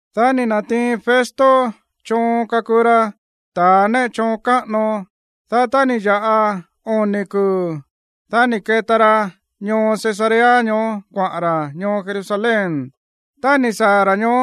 Dá ni̱ na̱tiin Festo choon kakuu ra ta̱ néꞌe choon káꞌano. Dá tá ni̱ ya̱ꞌa oni̱ kuu̱, dá ni̱ keta ra ñoo Cesarea ñoó kuaꞌa̱n ra̱ ñoo Jerusalén. Tá ni̱ saa̱ ra̱ ñoó,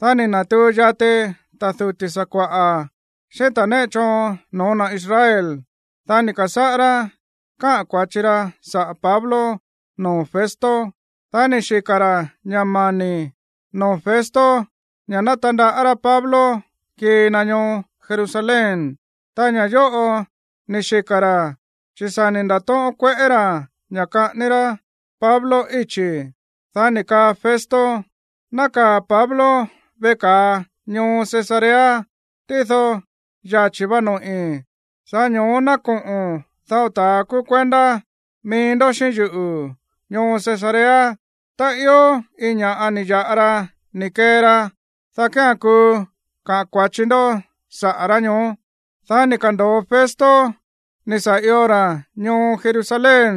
dá ni̱ na̱tuu yati ta̱ duti̱ sakua̱ꞌa̱ xíꞌín ta̱a néꞌe choon no̱ó na̱ Israel. Dá ni̱ ka̱sáꞌá rá káꞌa̱n kua̱chi ra saꞌa̱ Pablo noo̱ Festo. Dá ni̱ xika̱ ra̱ ña̱ mani̱ noo̱ Festo ña̱ ná tandaꞌá rá Pablo kii na ñoo Jerusalén. Ta ña̱ yóꞌo ni̱ xika̱ ra̱ chi̱ sa̱ ni̱ nda̱tóꞌón kueꞌé ra̱ ña̱ kaꞌání rá Pablo íchi̱. Dá ni̱ kaa Festo: ―Nákaa̱ Pablo veꞌe ka̱a ñoo Cesarea. Tído yachi̱ va noꞌi̱. Sa̱ꞌá ño̱ó ná koꞌo̱n dao ta̱a kúú kuendá mií ndó xíꞌín yuꞌu̱ ñoo Cesarea. Tá ió iin ña̱ꞌa ni̱ ya̱ꞌa ra ni̱ kee ra, dá kía̱n kuu kaꞌa̱n kua̱chi ndó saꞌa̱ rá ñoó. Dá ni̱ ka̱ndo̱o Festo ni̱ sa̱ io ra̱ ñoo Jerusalén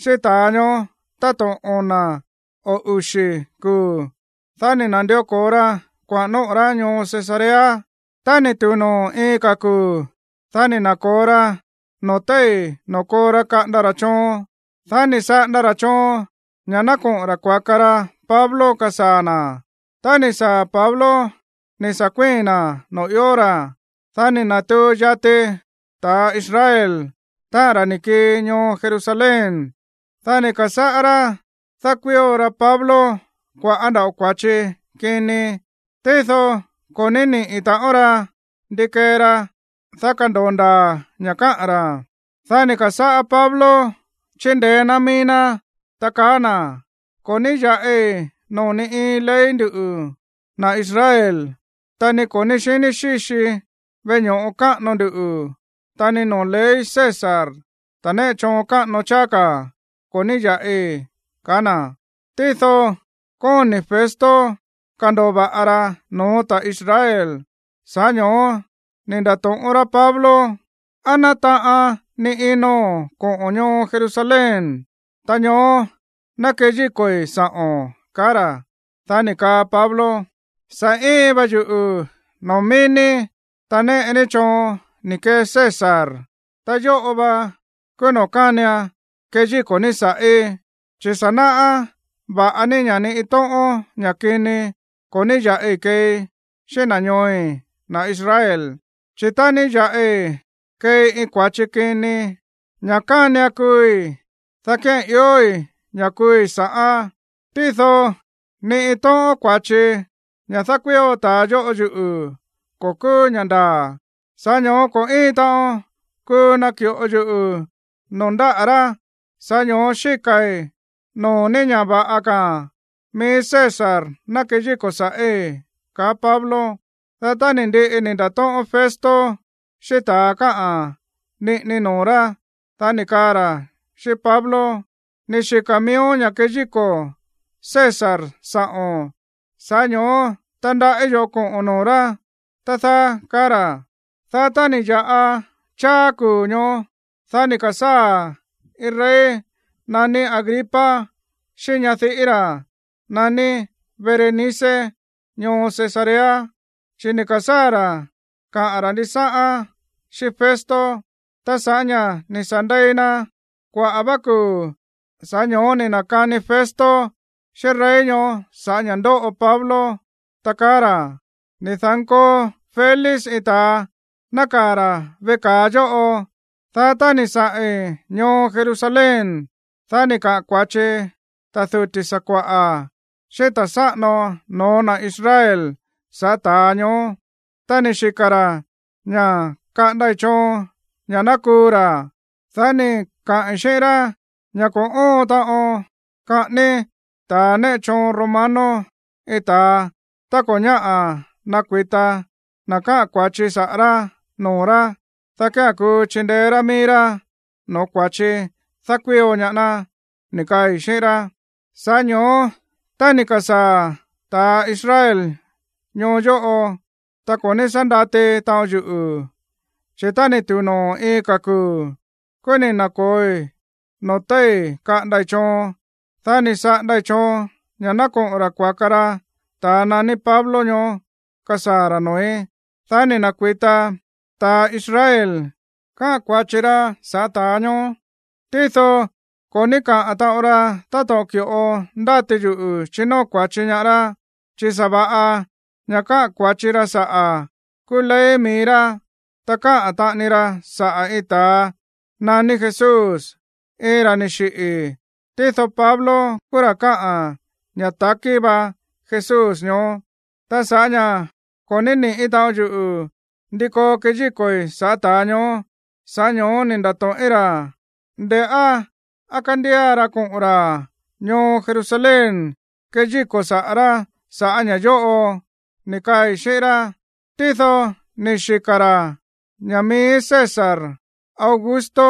xíꞌín ta̱a ñoó táto̱ꞌon ona̱ o uxi̱ kuu̱. Dá ni̱ na̱ndió ko̱o ra kuaꞌa̱n nóꞌo̱ rá ñoo Cesarea. Tá ni̱ tu̱u noo̱ iin ka̱ kuu̱, dá ni̱ na̱ko̱o ra noo̱ téi̱ noo̱ koo ra kaꞌanda ra̱ choon. Dá ni̱ saꞌanda ra̱ choon ña̱ ná koꞌo̱n ra̱ kuaka ra Pablo kasaa̱ na̱. Tá ni̱ saa̱ Pablo ni̱ sa̱ kuíi̱n na̱ noo̱ ió ra̱, dá ni̱ na̱tuu yati ta̱ Israel, táꞌa̱n ra̱ ni̱ kii ñoo Jerusalén. Dá ni̱ ka̱sáꞌá rá dákuío ra Pablo kua̱ꞌá nda̱ꞌo kua̱chi kini. Tído ko̱ ní niꞌi̱ taꞌon ra ndi kee ra, dá kando̱o ndaa̱ ña̱ káꞌa̱n ra̱. Dá ni̱ ka̱sáꞌá Pablo chindeé ná mií ná, ta kaá na̱: ―Ko̱ ní ya̱ꞌi noo̱ ni iin ley nduꞌu̱, na̱ Israel, ta ni ko̱ ní xiní xíxii veꞌe ño̱ꞌo káꞌano ndu, ta ni noo̱ ley César, ta̱ néꞌe choon káꞌano cháá ka̱, ko̱ ní ya̱ꞌi ―kaá na̱. Tído kóni̱ Festo kando̱o va̱ꞌa ra no̱ó ta̱ Israel. Sa̱ꞌá ño̱ó ni̱ nda̱to̱ꞌón rá Pablo: ―¿Á nátaꞌan ni ino̱n koꞌo̱ ñoo Jerusalén, ta ñoó ná keyíko̱i̱ sa̱ꞌo̱n? ―kaá ra̱. Dá ni̱ kaa Pablo: ―Sa̱ íin va yuꞌu̱ noo̱ mií ní, ta néꞌe ní choon ni̱ kee César. Ta yóꞌo va kúú noo̱ kánian keyíko̱ ní sa̱ꞌí. Chi̱ sa̱ náꞌá va̱ꞌa ní ña̱ ni iin tóꞌón ña̱ kini ko̱ ní ya̱ꞌi keei xíꞌín na̱ ñooi̱, na̱ Israel. Chi̱ tá ní ya̱ꞌi keei iin kua̱chi kini, ña̱ kánian kuui̱, dá kía̱n iói̱ ña̱ kuui̱ sa̱ꞌán. Tído ni iin tóꞌón kua̱chi, ña̱ dákuío ta̱a yóꞌo yuꞌu̱, ko̱ kúú ña̱ ndaa̱, sa̱ꞌá ño̱ó ko̱ íin taꞌon kuu naki̱ꞌo yuꞌu̱ noo̱ ndáꞌa̱ rá. Sa̱ꞌá ño̱ó xíka̱i̱ noo̱ ní ña̱ va̱ꞌa ka̱ mií César ná keyíko̱ sa̱ꞌí ―kaá Pablo. Dá tá ni̱ ndiꞌi ni̱ nda̱tóꞌón Festo xíꞌín ta̱a káꞌa̱n niꞌini noo̱ rá, dá ni̱ kaa ra̱ xíꞌín Pablo: ―Ni̱ xika̱ miíón ña̱ keyíko̱ César sa̱ꞌo̱n. Sa̱ꞌá ño̱ó tandaꞌí yo̱ꞌó koꞌo̱n noo̱ rá, tá dáá ―kaá ra̱. Dá tá ni̱ ya̱ꞌa cháá kuu̱ ñoó, dá ni̱ ka̱sáa̱ iin rey naní Agripa xíꞌín ñadiꞌí ra̱ naní Berenice ñoo Cesarea, chi̱ ni̱ ka̱sáa̱ ra̱ kaꞌa̱n ra̱ ndisáꞌán xíꞌín Festo. Ta sa̱ꞌá ña̱ ni̱ sa̱ ndei na kuaꞌa̱ vá kuu̱, sa̱ꞌá ño̱ó ni̱ na̱kani Festo xíꞌín rey ñoó sa̱ꞌá ña̱ ndóꞌo Pablo, ta kaá ra̱: ―Ni̱ da̱nkoo Félix iin ta̱a nákaa̱ ra̱ veꞌe ka̱a yóꞌo. Dá tá ni̱ saꞌi̱n ñoo Jerusalén, dá ni̱ kaꞌa̱n kua̱chi ta̱ duti̱ sakua̱ꞌa̱ xíꞌín ta̱ sáꞌano no̱ó na̱ Israel sa̱ꞌá ta̱a ñoó, ta ni̱ xika̱ ra̱ ña̱ ná kaꞌandai̱ choon ña̱ ná kuu ra̱. Dá ni̱ kaꞌi̱n xíꞌín rá ña̱ ko̱ óon taꞌon kaꞌání ta̱a néꞌe choon romano iin ta̱a tá ko̱ ñáꞌa̱ ná kuita na̱ káꞌa̱n kua̱chi saꞌa̱ rá noo̱ rá, dá kía̱n kuu chindeé rá mií rá no̱ó kua̱chi dákuío ñaá ná, ni̱ kaai̱ xíꞌín rá. Sa̱ꞌá ño̱ó tá ni̱ ka̱sáa̱ ta̱ Israel ñoo yóꞌo, ta ko̱ ní sá ndati taꞌon yuꞌu̱, chi̱ tá ni̱ tu̱u noo̱ iin ka̱ kuu̱, kúú ni̱ na̱ko̱oi noo̱ téi̱ kaꞌandai̱ choon. Dá ni̱ saꞌandai̱ choon ña̱ ná koꞌo̱n ra̱ kuaka ra ta̱a naní Pablo ñoó kasaa̱ ra̱ noo̱í. Dá ni̱ na̱kui̱ta ta̱ Israel káꞌa̱n kua̱chi ra sa̱ꞌá ta̱a ñoó. Tído ko̱ ní káꞌa̱n taꞌon ra táto̱ꞌon ki̱ꞌo ndáti yuꞌu̱ chinóo kua̱chi ñaá rá. Chi̱ sa̱va̱ꞌa ña̱ káꞌa̱n kua̱chi ra saꞌa̱ kúú ley mií rá. Ta káꞌa̱n taꞌani ra saꞌa̱ iin ta̱a naní Jesús, iin ra̱ ni̱ xiꞌi̱, tído Pablo kúú ra̱ kaá ña̱ takí va Jesús ñoó. Ta sa̱ꞌá ña̱ ko̱ ní niꞌi̱ taꞌon yuꞌu̱ ndi koo keyíko̱i̱ sa̱ꞌá ta̱a ñoó, sa̱ꞌá ño̱ó ni̱ nda̱to̱ꞌín ra̱, nde̱ꞌá á kándía ra koꞌo̱n ra̱ ñoo Jerusalén keyíko̱i̱ saꞌa̱ rá sa̱ꞌá ña̱ yóꞌo, ni̱ kaai̱ xíꞌín rá. Tído ni̱ xika̱ ra̱ ña̱ mií César Augusto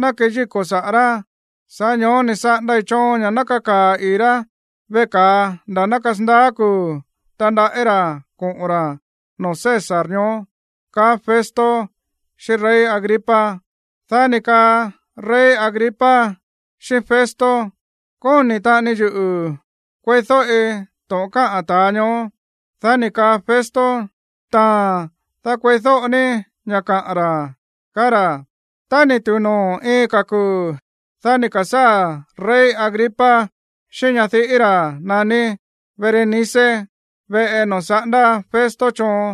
ná keyíko̱ saꞌa̱ rá. Sa̱ꞌá ño̱ó ni̱ saꞌandai̱ choon ña̱ ná kakaa̱ ii̱ rá veꞌe ka̱a nda̱ ná kasandaá kuu̱ tandaꞌí ra̱ koꞌo̱n ra̱ noo̱ César ñoó ―kaá Festo xíꞌín rey Agripa. Dá ni̱ kaa rey Agripa xíꞌín Festo: ―Kóni̱ taꞌani yuꞌu̱ kueídóꞌi to̱ꞌon káꞌa̱n ta̱a ñoó. Dá ni̱ kaa Festo: ―Taa̱n, dá kueídóꞌo ní ña̱ kaꞌa̱n ra̱ ―kaá ra̱. Tá ni̱ tu̱u noo̱ iin ka̱ kuu̱, dá ni̱ ka̱sáa̱ rey Agripa xíꞌín ñadiꞌí ra̱ naní Berenice veꞌe noo̱ saꞌándá Festo choon,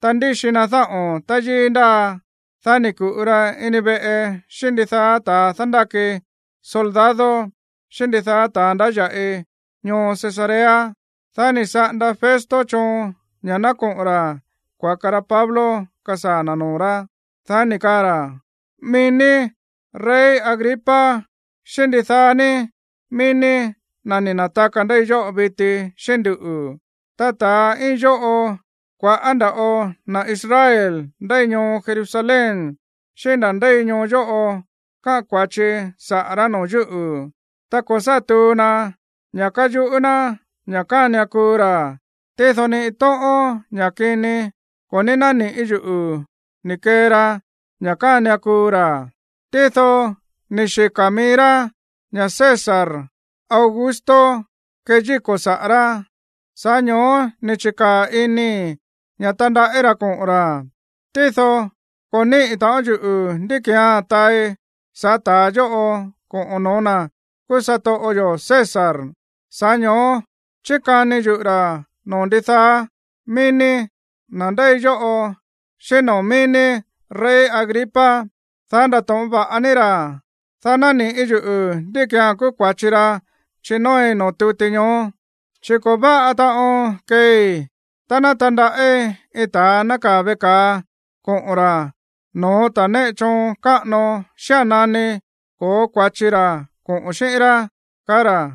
ta ndíxi na dáꞌo̱n táyíí ndáa. Dá ni̱ ku̱ꞌu ra ini veꞌe xíꞌín ndidaá ta̱a dándáki soldado, xíꞌín ndidaá ta̱a ndáya̱ꞌi ñoo Cesarea. Dá ni̱ saꞌanda Festo choon ña̱ ná koꞌo̱n ra̱ kuaka ra Pablo kasaa̱ na̱ noo̱ rá. Dá ni̱ kaa ra̱: ―Mií ní, rey Agripa, xíꞌín ndidaá ní mií ní, na̱ ni̱ na̱taka ndéi yóꞌo viti xíꞌín nduꞌu̱. Ta ta̱a íin yóꞌo, kua̱ꞌá nda̱ꞌo na̱ Israel ndéi ñoo Jerusalén xíꞌín na̱ ndéi ñoo yóꞌo káꞌa̱n kua̱chi saꞌa̱ rá noo̱ yúꞌu̱. Ta ko̱ sá tuu na ña̱ káyuꞌú ná ña̱ kánian kuu ra̱. Tído ni iin tóꞌón ña̱ kini ko̱ ní nániꞌi̱ yuꞌu̱ ni̱ kee ra ña̱ kánian kuu ra̱. Tído ni̱ xika̱ mií rá ña̱ César Augusto keyíko̱ saꞌa̱ rá. Sa̱ꞌá ño̱ó ni̱ chi̱kaa̱ inii̱ ña̱ tandaꞌí ra̱ koꞌo̱n ra̱. Tído ko̱ níꞌi̱ taꞌon yuꞌu̱ ndí ki̱án taai sa̱ꞌá ta̱a yóꞌo koꞌa̱n no̱ó na̱ kúú satoꞌo yo̱ César. Sa̱ꞌá ño̱ó chíkani yuꞌu̱ ra̱ noo̱ ndidaá mií ní, na̱ ndéi yóꞌo, xíꞌín noo̱ mií ní, rey Agripa, dá ndato̱ꞌón va̱ꞌa ní ra̱, dá naniꞌi̱ yuꞌu̱ ndí ki̱án kúú kua̱chi ra chinóoi noo̱ tuti ñoó. Chi̱ ko̱ váꞌa taꞌon keei tá ná tandaꞌí iin ta̱a nákaa̱ veꞌe ka̱a koꞌo̱n ra̱ no̱ó ta̱ néꞌe choon káꞌano xía̱n nani ko̱ó kua̱chi ra̱ koꞌo̱n xíꞌín rá ―kaá ra̱.